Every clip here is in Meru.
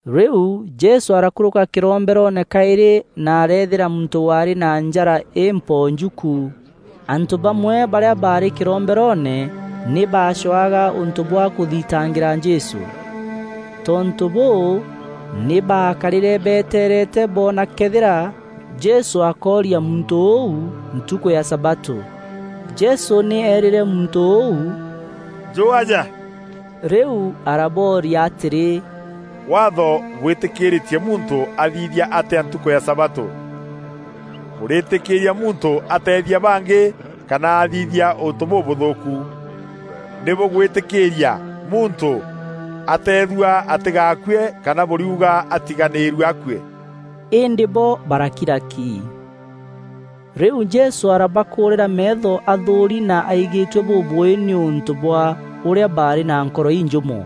Rîu Jesû arakûrûka kîromberoone kaîrî na areethîra muntû waarî na njara împonju ku. Antû bamwe barîa baarî kîromberoone nî baacwaga ûntû bwa kûthitangîra Jesû. Tontû bûû, nî baakarîre beeteerete boona këethîra Jesû akooria muntû ûu ntukû ya sabatû. Jesû nî eerîre muntû ûu, “Njû aja.” Rîu arabooria atîrî, “Waatho bwîtîkîîrîtie muntû athithia atîa ntukû ya sabatû? Bûrîtîkîîria muntû ateethia bangî kana athithia untû bûbûthûûku? Nî bûgwîtîkîîria muntû ateethua atîgakue kana bûriuga atiganîîrue akue?” Îndî bo barakira ki. Rîu Jesû arabakûûrîra meetho athûûri na aigîtue bûbûûî nîûntû bwa ûrîa baarî na nkoro injûmû.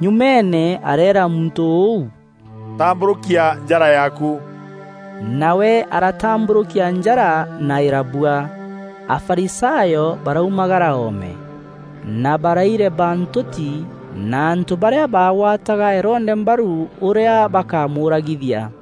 Nyumeene areera muntû ûu, “Tambûrûkia njara yaaku!” Nawe aratambûrûkia njara na îrabua. Afarisayo baraumagara oome, na baraireba ntûti na antû barîa baagwataga Herode mbaru, ûrîa bakamûûragithia.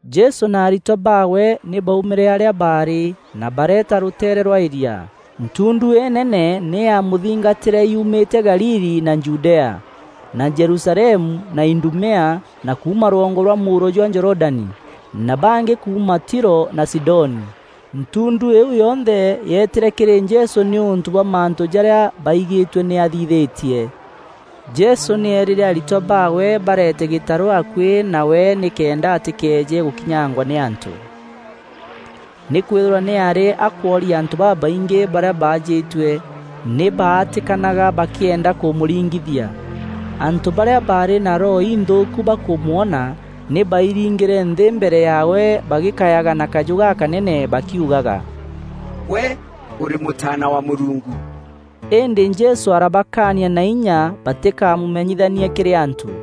Jesû na aritwa baawe nî baaumîre arîa baarî na bareeta rûteere rwa îria. Ntundu înene nî yaamûthingatîre yuumîte Galili na Judea, na Jerusalemu, na Idumea, na kuuma rwongo rwa mûuro jwa Jorodani, na bangî kuuma Tiro na Sidoni. Ntundu îîu yonthe yeetîre kîrî Jesû nîûntû bwa mantû jarîa baigîtue nî aathithîtie. Jesû nî eerîre aritwa baawe barete gîtarû akuî nawe nîkenda atîkeeje gûkinyangwa nî antû. Nîkwîthîrwa nî aarî akwooria antû babaingî, barîa baajîtue nî baatîkanaga bakîenda kûmûringithia. Antû barîa baarî na roho inthûûku bakûmwona, nî bairingîre nthî mbere yaawe bagîkayaga na kajû gakanene bakiugaga, “Gwe ûrî Mûtaana wa Mûrungu!” Îndî Jesû arabakaania na inya batîkamûmenyithanie kîrî antû.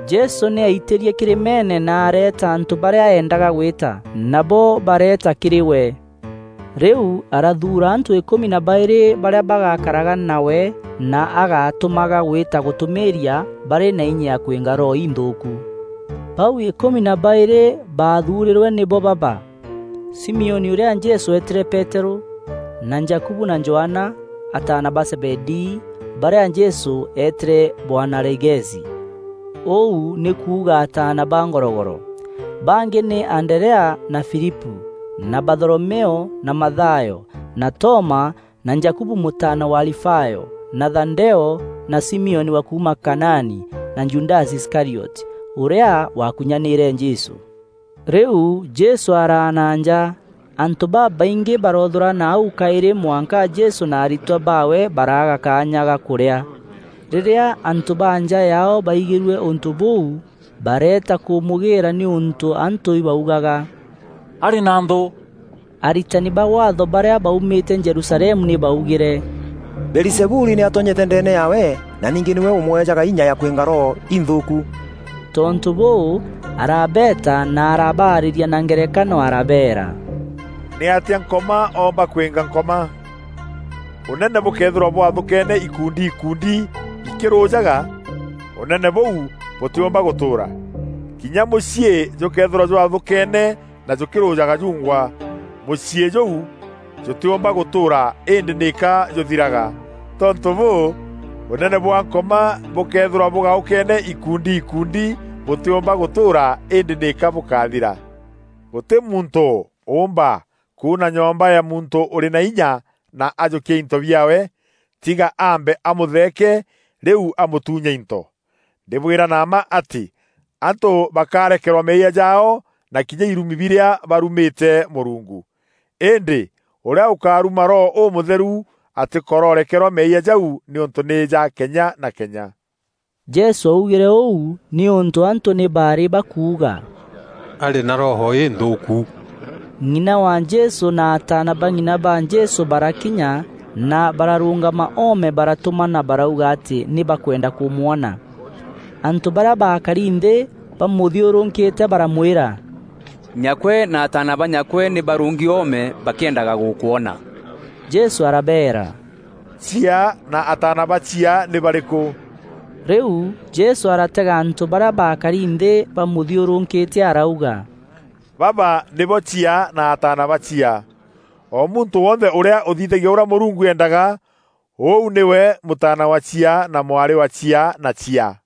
Jesû nî aitîrie kîrîmeene na areeta antû barîa eendaga gwîta, nabo bareeta kîrî we. Rîu arathuura antû îkûmi na baîrî barîa bagakaraga nawe na agatûmaga gwîta gûtûmîîria barî na inya ya kwînga roho inthûûku. Bau îkûmi na baîrî baathuurîrwe nîbo baba: Simioni ûrîa Jesû eetîre Peterû, na Jakubu na Johana, ataana ba Zebedii, barîa Jesû eetîre Boanerigesi, ûu nî kuuga “Ataana ba ngorogoro.” Bangî nî Anderea na Filipû na Batholomeo na Mathayo na Toma na Jakubu mûtaana wa Alifayo, na Thadeo na Simioni wa kuuma Kanaani, na Judasi Iskarioti, ûrîa waakunyanîîre Jesû. Rîu Jesû araana nja. Antû babaingî baroothûrana au kaîrî mwanka Jesû na aritwa baawe baraaga kaanya ga kûrîa. Rîrîa antû ba nja yaao baigîrue ûntû bûu, bareeta kûmûgîîra nîûntû antû baugaga “Arî na nthû.” Aritani ba Waatho barîa baumîte Jerusalemu nî baugîre, “Beelizebuli nî atonyete ndeene yaawe na ningî nîwe ûmweejaga inya ya kwînga roho inthûûku.” Tontû bûû, arabeeta na arabaarîria na ngerekano arabeera, “Nîatîa Nkoma oomba kwînga Nkoma? Ûnene bûkëethîrwa bwathûkeene ikundi ikundi bikirûjaga, ûnene bûu bûtîûmba gûtûûra. Kinya mûciî jûkeethîrwa jwathûkeene na jûkîrûjaga jungwa, mûciî jûu jûtîûmba gûtûûra îndî nîka jûthiraga. Tontû bûû, ûnene bwa Nkoma bûkëethîrwa bûgaûkeene ikundi ikundi bûtîûmba gûtûûra îndî nîka bûkathira. “Gûtî muntû ûûmba kûûna nyomba ya muntû ûrî na inya na ajûkia into biaawe, tiga aambe amûtheeke, rîu amûtuunye into. Ndîbwîra na mma atî antû bakarekerwa meeyia jaao na kinya irumi birîa barumîte Mûrungu. “Îndî ûrîa ûkaruma Roho Ûmûtheru atîkororekerwa meeyia jau nîûntû nî ja kenya na kenya.” Jesû augîre ûu nîûntû antû nî baarî bakuuga, “Arî na roho înthûûku.” Ng'ina wa Jesû na ataana ba ng'ina ba Jesû barakinya na bararûngama oome baratûmana barauga atî nî bakwenda kûmwona. Antû barîa baakari nthî bamûthiûrûkîte baramwîra, “Nyakwe na ataana ba nyakwe nî barûngî oome bakîendaga gûkwona.” Jesû arabeera, “Chiaa na ataana ba chiaa nî barîkû?” Rîu Jesû aratega antû barîa baakari nthî bamûthiûrûkîte arauga, “Baba nîbo chiaa na ataana ba chiaa. O muntû wonthe ûrîa ûthithagia ûrîa Mûrungu eendaga, ûu nîwe mûtaana wa chiaa na mwarî wa chiaa na chiaa.”